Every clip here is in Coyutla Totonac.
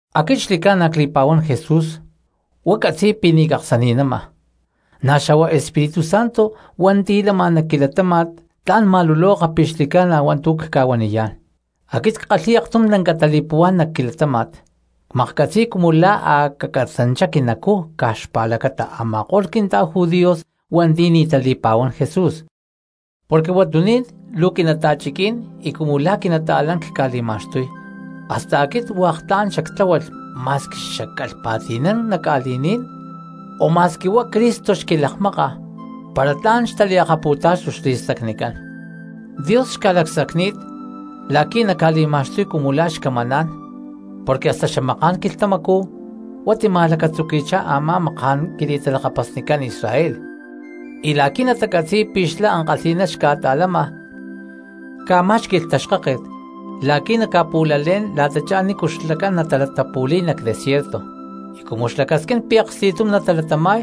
Aquit xli̠ca̠na cli̠pa̠huán Jesús y huá catzi̠y pi̠ ni̠ caksani̠nama, na̠ xa̠huá Espíritu Santo hua̠nti̠ lama nac quilatáma̠t tla̠n ma̠luloka pi̠ xli̠ca̠na hua̠ntu̠ cca̠huaniyá̠n. Aquit ckalhi̠y aktum lanca tali̠puhuá̠n nac quilatáma̠t, cmaklhcatzi̠y cumu la̠ a̠ cacatzanchá quinacú caj xpa̠lacata a̠ma̠ko̠lh quinta̠judíos hua̠nti̠ ni̠ tali̠pa̠huán Jesús. Porque huatuní̠n luu quinata̠chiquí̠n y cumu la̠ quinata̠lán cca̠li̠ma̠xtuy, hasta aquit hua̠k tla̠n xactláhualh ma̠squi xacalh pa̠ti̠nán nac ca̠li̠ní̠n, o ma̠squi huá Cristo xquilakmáka para chuná tla̠n xtalaktáxtulh xli̠stacnicán. Ma̠n Dios xca̠lacsacni̠t la̠qui̠ naca̠li̠ma̠xtuy cumu la̠ xcamaná̠n, porque hasta xamaká̠n quilhtamacú huá tima̠lacatzuqui̠chá a̠má maká̠n quili̠talakapasnicán Israel, y la̠qui̠ natacatzi̠y pi̠ xlá ankalhi̠ná xca̠ta̠lama ca̠má̠xqui̠lh taxkáket la̠qui̠ naca̠pu̠lalé̠n la̠tachá nícu xlacán natalatapu̠li̠y nac desierto, y cumu xlacasquín pi̠ aksti̠tum natalatama̠y,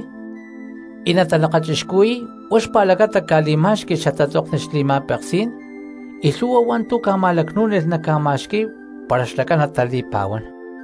tla̠n natalakachixcuhui̠y huá xpa̠lacata ca̠li̠má̠xqui̠lh xatatzokni xli̠ma̠peksí̠n, y lhu̠hua hua̠ntu̠ ca̠ma̠lacnú̠nilh naca̠ma̠xqui̠y para xlacán natali̠pa̠huán.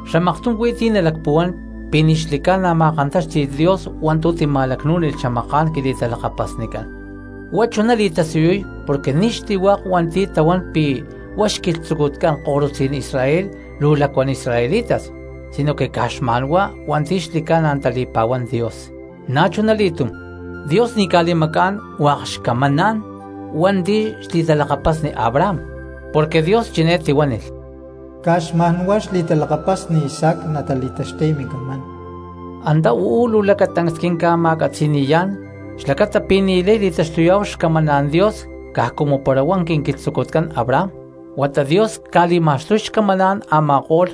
Xamaktum huí ti̠ nalacpuhuán pi̠ ni̠ xli̠ca̠na ma̠kantáxti̠lh Dios hua̠ntu̠ tica̠ma̠lacnú̠nilh xamaká̠n quili̠talakapasnicán, huata huá chuná li̠tasiyuy porque ni̠ xli̠hua̠k hua̠nti̠ tahuán pi̠ huá xquilhtzucutcán ko̠rutzí̠n Israel luu lacuán israelitas, sinoque caj xma̠nhuá hua̠nti̠ xli̠ca̠na tali̠pa̠huán Dios. Na̠chunali̠túm, Dios ni̠ ca̠li̠macá̠n hua̠k xcamaná̠n hua̠nti̠ xli̠talakapasni Abraham, porque Dios chiné tihuánilh: “Caj xma̠nhuá xli̠talakapasni Isaac natali̠taxtuy mincamán.” Antá uú luu lacatancs quinca̠ma̠catzi̠ni̠yá̠n xlacata pi̠ ni̠lay li̠taxtuyá̠hu xcamaná̠n Dios caj cumu para huá quinquilhtzucutcán Abraham, huata Dios ca̠li̠ma̠xtuy xcamaná̠n a̠ma̠ko̠lh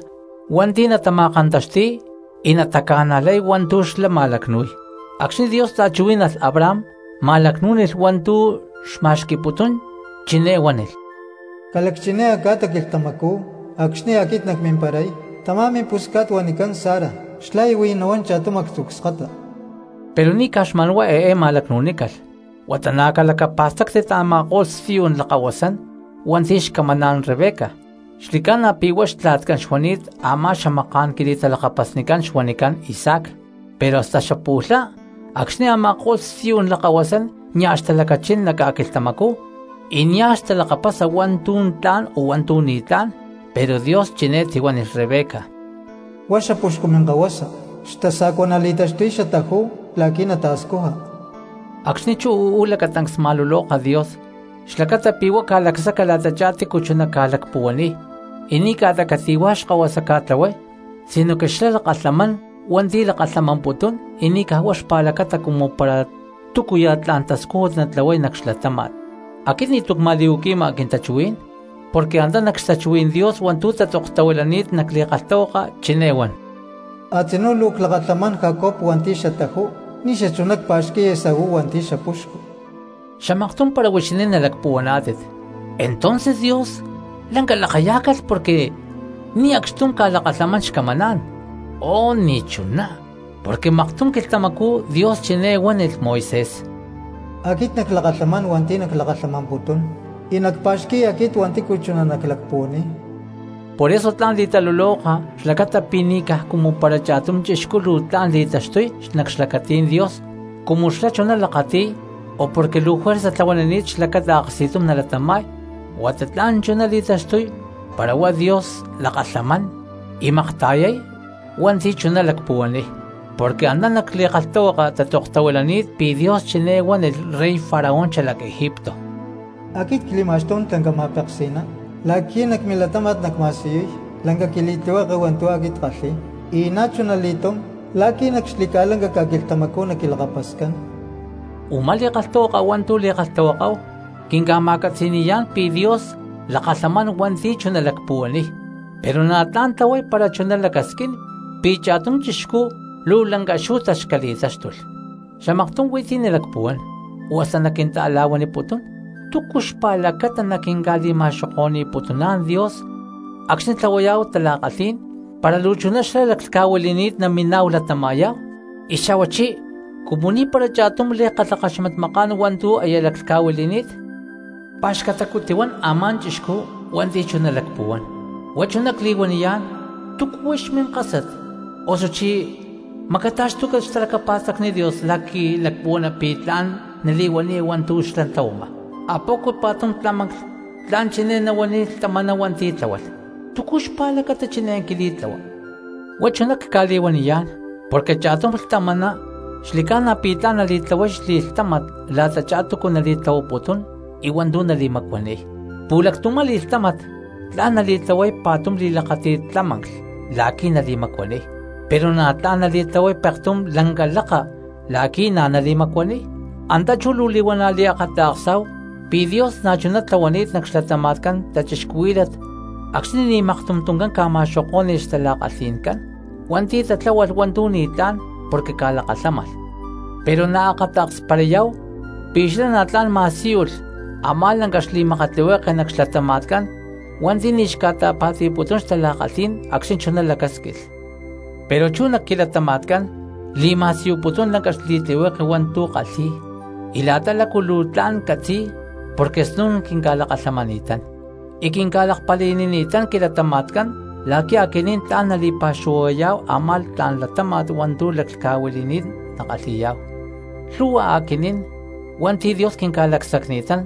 hua̠nti̠ natama̠kantaxti̠y y nataca̠najlay hua̠ntu̠ xlá ma̠lacnu̠y. Acxni̠ Dios ta̠chuhuí̠nalh Abraham ma̠lacnú̠nilh hua̠ntu̠ xma̠xqui̠putún, chiné huánilh: “Ca̠lacchiné a̠ca̠ta quilhtamacú acxni̠ aquit nacmimparay, tamá mimpusca̠t huanicán Sara xlá aya huij nahuán cha̠tum actzu̠ cskata.” Pero ni̠ caj xma̠nhuá eé ma̠lacnu̠nícalh, huata na̠ calacapa̠stáctit a̠ma̠ko̠lh stiyú̠n lakahuasán hua̠nti̠ xcamaná̠n Rebeca, xli̠ca̠na pi̠ huá xtla̠tcán xuani̠t a̠má xamaká̠n quili̠talakapasnicán xuanicán Isaac. Pero hasta xapu̠lhá acxni̠ a̠ma̠ko̠lh stiyú̠n lakahuasán nia̠ xtalacachín nac ca̠quilhtamacú y nia̠ xtalakapasa hua̠ntu̠ tla̠n o hua̠ntu̠ ni̠tlá̠n, pero Dios chiné tihuánilh Rebeca: “Huá xapuxcu minkahuasa xtasa̠cua nali̠taxtuy xataju la̠qui̠ nata̠scuja.” Acxni̠ chú uú lacatancs ma̠luloka Dios xlacata pi̠ huá ca̠lacsaca la̠tachá tícu chuná ca̠lacpuhuaniy, y ni̠ ca̠ta cati̠huá xkahuasa ca̠tlahuay, sinoque xlá lakalhamán hua̠nti̠ lakalhamamputún, y ni̠ caj huá xpa̠lacata cumu para túcuya̠ tla̠n tascújut natlahuay nac xlatáma̠t. Aquit ni̠tu̠ cma̠li̠huaqui̠ma quintachuhuí̠n porque antá nac xtachuhuí̠n Dios hua̠ntu̠ tatzoktahuilani̠t nac li̠kalhtahuaka chiné huan: “Atzinú luu clakalhámalh Jacob hua̠nti̠ xataju ni̠ xachuná cpá̠xqui̠lh Esaú hua̠nti̠ xapuxcu.” Xamaktum para huixinín nalacpuhuaná̠tit: “¿Entonces Dios lanca lakayá̠calh porque ni̠ acxtum ca̠lakalhamán xcamaná̠n?” ¡Oh, ni̠chuná! Porque maktum quilhtamacú Dios chiné huánilh Moisés: “Aquit naclakalhamán hua̠nti̠ naclakalhamamputún, y nacpa̠xqui̠y hua̠nti̠ aquit chuná naclacpuhuaniy.” Por eso tla̠n li̠taluloka xlacata pi̠ ni̠ caj cumu para cha̠tum chixcú luu tla̠n cristiano li̠taxtuy nac xlacatí̠n Dios cumu xlá chuná lakati̠y o porque luu juerza tlahuanini̠t xlacata aksti̠tum nalatama̠y, huata tla̠n chuná li̠taxtuy para huá Dios lakalhamán y makta̠yay hua̠nti̠ chuná lacpuhuaniy. Porque antá nac li̠kalhtahuaka tatzoktahuilani̠t pi̠ Dios chiné huánilh rey Faraón xalac Egipto: “Aquit cli̠ma̠xtún lanca ma̠peksi̠ná la̠qui̠ nac milatáma̠t nacma̠siyuy lanca quili̠tlihueke hua̠ntu̠ aquit ckalhi̠y, y na̠chuna li̠túm la̠qui̠ nac xli̠ca̠lanca ca̠quilhtamacú naquilakapascán.” Umá li̠kalhtahuaka hua̠ntu̠ li̠kalhtahuakáhu quinca̠ma̠catzi̠ni̠yá̠n pi̠ Dios lakalhamán hua̠nti̠ chuná lacpuhuaniy, pero na̠ tla̠n tlahuay para chuná lacasquín pi̠ cha̠tum chixcú luu lanca xú̠tax cali̠táxtulh. Xamaktum huí ti̠ nalacpuhuán, o hasta naquinta̠la̠huaniputún: “¿Túcu xpa̠lacata naquinca̠li̠ma̠xoko̠ni̠putuná̠n Dios acxni̠ tlahuayá̠hu tala̠kalhí̠n para luu chuná xlá laclhca̠huili̠ni̠t naminá̠hu latama̠yá̠hu, y xa̠huachí cumu ni̠para cha̠tum lay kalhakaxmatmakán hua̠ntu̠ aya laclhca̠huili̠ni̠t?” ¡Pa̠xcatacu tihuan a̠má chixcú hua̠nti̠ chuná lacpuhuán! Huá chuná cli̠huaniyá̠n, ¿túcu huix minkásat, osuchí macata̠xtuca xtalacapa̠stacni Dios la̠qui̠ lacpuhuana pi̠ tla̠n nali̠huaniya hua̠ntu̠ xlá tlahuama? ¿A poco pa̠tum tlámanclh tla̠n chiné nahuaniy lhtamaná hua̠nti̠ tláhualh: “¿Túcu xpa̠lacata chiné quili̠tlahua?” Huá chuná cca̠li̠huaniyá̠n porque cha̠tum lhtamaná xli̠ca̠na pi̠ tla̠n li̠tlahuay xli̠lhtámat la̠tachá túcu nali̠tlahuaputún y hua̠ntu̠ nali̠macuaniy; pu̠lactumá li̠lhtámat tla̠n nali̠tlahuay pa̠tum li̠lakáti̠t tlámanclh la̠qui̠ nali̠macuaniy, pero na̠ tla̠n li̠tlahuay pektum lanca la̠ka la̠qui̠ na̠ nali̠macuaniy. Antá chú luu li̠huana̠ liakata̠ksá̠hu pi̠ Dios na̠chuná tlahuani̠t nac xlatama̠tcán cristianos acxni̠ ni̠ maktum tuncán ca̠ma̠xokó̠ni̠lh xtala̠kalhi̠ncán hua̠nti̠ tatláhualh hua̠ntu̠ ni̠tlá̠n porque ca̠lakalhámalh, pero na̠ akata̠ksparayá̠hu pi̠ xlá na̠ tla̠n ma̠síyulh a̠má lanca xli̠makatlihueke nac xlatama̠tcán hua̠nti̠ ni̠ xca̠ta̠pa̠ti̠putún xtala̠kalhí̠n acxni̠ chuná lacásquilh. Pero chú nac quilatama̠tcán li̠ma̠siyuputún lanca xli̠tlihueke hua̠ntu̠ kalhi̠y y la̠ta lácu luu tla̠n catzi̠y, porque snu̠n quinca̠lakalhamani̠tán y quinca̠lakpali̠nini̠tán quilatama̠tcán la̠qui̠ aquinín tla̠n nali̠pa̠xuhuayá̠hu a̠má tla̠n latáma̠t hua̠ntu̠ laclhca̠huili̠ni̠t nakalhi̠yá̠hu. Lhu̠hua aquinín hua̠nti̠ Dios quinca̠lacsacni̠tán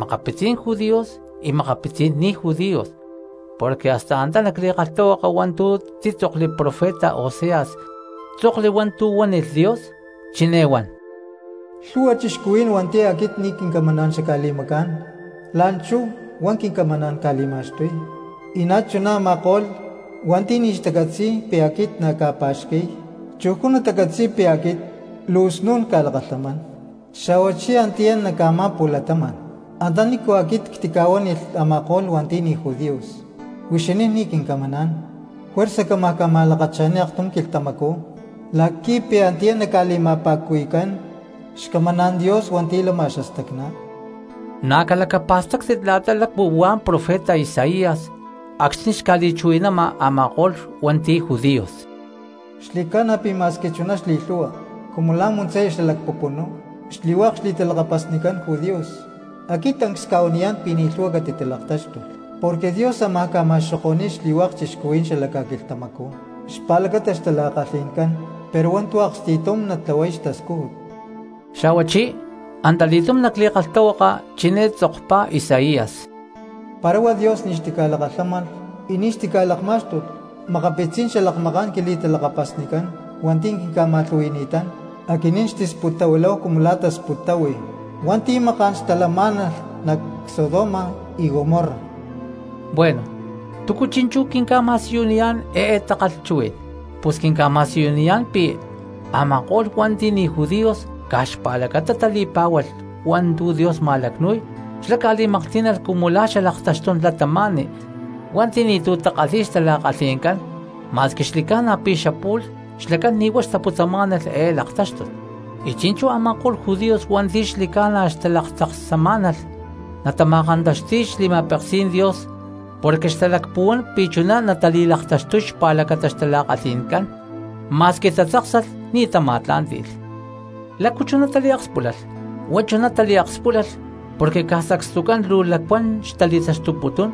makapitzí̠n judíos y makapitzí̠n ni̠ judíos. Porque hasta antá nac li̠kalhtahuaka hua̠ntu̠ títzokli profeta Oseas tzokli hua̠ntu̠ huánilh Dios, chiné huan: Lhu̠hua cristianos hua̠nti̠ aquit ni̠ quincamaná̠n xacca̠li̠macá̠n, la̠nchú huá quincamaná̠n cca̠li̠ma̠xtuy; y na̠chuná a̠ma̠ko̠lh hua̠nti̠ nia̠ xtacatzi̠y pi̠ aquit na̠ cca̠pa̠xqui̠y, chujcú natacatzi̠y pi̠ aquit luu snu̠n cca̠lakalhamán. Xa̠huachí antiyá nac a̠má pu̠latama̠n antanícu aquit ctica̠huánilh a̠ma̠ko̠lh hua̠nti̠ ni̠ judíos: “Huixinín ni̠ quincamaná̠n”, juerza cámaj ma̠lakcha̠ni̠y aktum quilhtamacú la̠qui̠ pi̠ antiyá naca̠li̠ma̠pa̠cuhui̠cán xcamaná̠n Dios hua̠nti̠ lama xastacná. Na̠ calacapa̠stáctit la̠ta lácu huá profeta Isaías acxni̠ xca̠li̠chuhui̠nama a̠ma̠ko̠lh hua̠nti̠ judíos: “Xli̠ca̠na pi̠ ma̠squi chuná xli̠lhu̠hua cumu la̠ muntzaya xalac pupunú xli̠hua̠k xli̠talakapasnicán judíos, aquit tancs cca̠huaniyán pi̠ ni̠ lhu̠hua catitalaktáxtulh. Porque Dios ámaj ca̠ma̠xoko̠ni̠y xli̠hua̠k cristianos xala ca̠quilhtamacú xpa̠lacata xtala̠kalhi̠ncán, pero hua̠ntu̠ aksti̠tum natlahuay xtascújut.” Xa̠huachí antali̠túm nac li̠kalhtahuaka chiné titzokpá Isaías: Para huá Dios ni̠ xtica̠lakalhámalh y ni̠ xtica̠lakmá̠xtulh makapitzí̠n xalakmaká̠n quili̠talakapasnicán hua̠nti̠ quinca̠ma̠lhu̠hui̠ni̠tán, aquinín xtisputtahuiláhu cumu la̠ tasputtahuílalh hua̠nti̠ maká̠n xtalamá̠nalh nac Sodoma y Gomorra. Bueno, ¿túcu chi̠nchú quinca̠ma̠siyuniyá̠n eé takalhchuhuí̠n? Pus quinca̠ma̠siyuniyá̠n pi̠ a̠ma̠ko̠lh hua̠nti̠ ni̠ judíos caj xpa̠lacata tali̠pá̠hualh hua̠ntu̠ Dios ma̠lacnu̠y, xlá ca̠li̠maklhtí̠nalh cumu la̠ xalaktaxtún cristianos hua̠nti̠ ni̠tu̠ takalhi̠y xtala̠kalhi̠ncán, ma̠squi xli̠ca̠na pi̠ xapu̠lh xlacán ni̠ huá xtaputzamá̠nalh eé laktáxtut. Y chi̠nchú a̠ma̠ko̠lh judíos hua̠nti̠ xli̠ca̠na xtalaktzaksamá̠nalh natama̠kantaxti̠y xli̠ma̠peksí̠n Dios porque xtalacpuhuán pi̠ chuná natali̠laktaxtuy xpa̠lacata xtala̠kalhi̠ncán, ma̠squi tatzáksalh ni̠ tama̠tlá̠nti̠lh. ¿Lácu chuná taliakspúlalh? Huá chuná taliakspúlalh porque caj sacstucán luu lacuán cristianos xtali̠taxtuputún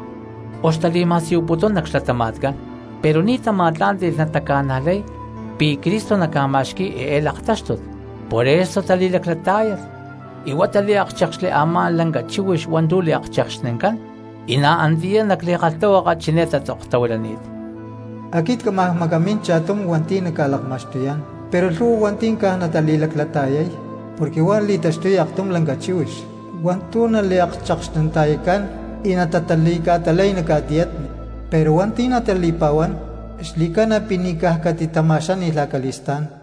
o xtali̠ma̠siyuputún nac xlatama̠tcán, pero ni̠ tama̠tlá̠nti̠lh nataca̠najlay pi̠ Cristo naca̠ma̠xqui̠y eé laktáxtut. Por eso tali̠laclatá̠yalh y huá taliákchekxli a̠má “lanca chíhuix hua̠ntu̠ liakchekxnincán.” Y na̠ antiyá nac li̠kalhtahuaka chiné tatzoktahuilani̠t: Aquit cámaj macamín cha̠tum hua̠nti̠ naca̠lakma̠xtuyá̠n, pero lhu̠hua hua̠nti̠ caj natali̠laclata̠yay porque huá li̠taxtuy aktum lanca chíhuix hua̠ntu̠ naliakchekxninta̠yacán y natatali̠ca̠talay nac ca̠tiyatni. Pero hua̠nti̠ natali̠pa̠huán xli̠ca̠na pi̠ ni̠ caj catitama̠xáni̠lh acali̠stá̠n.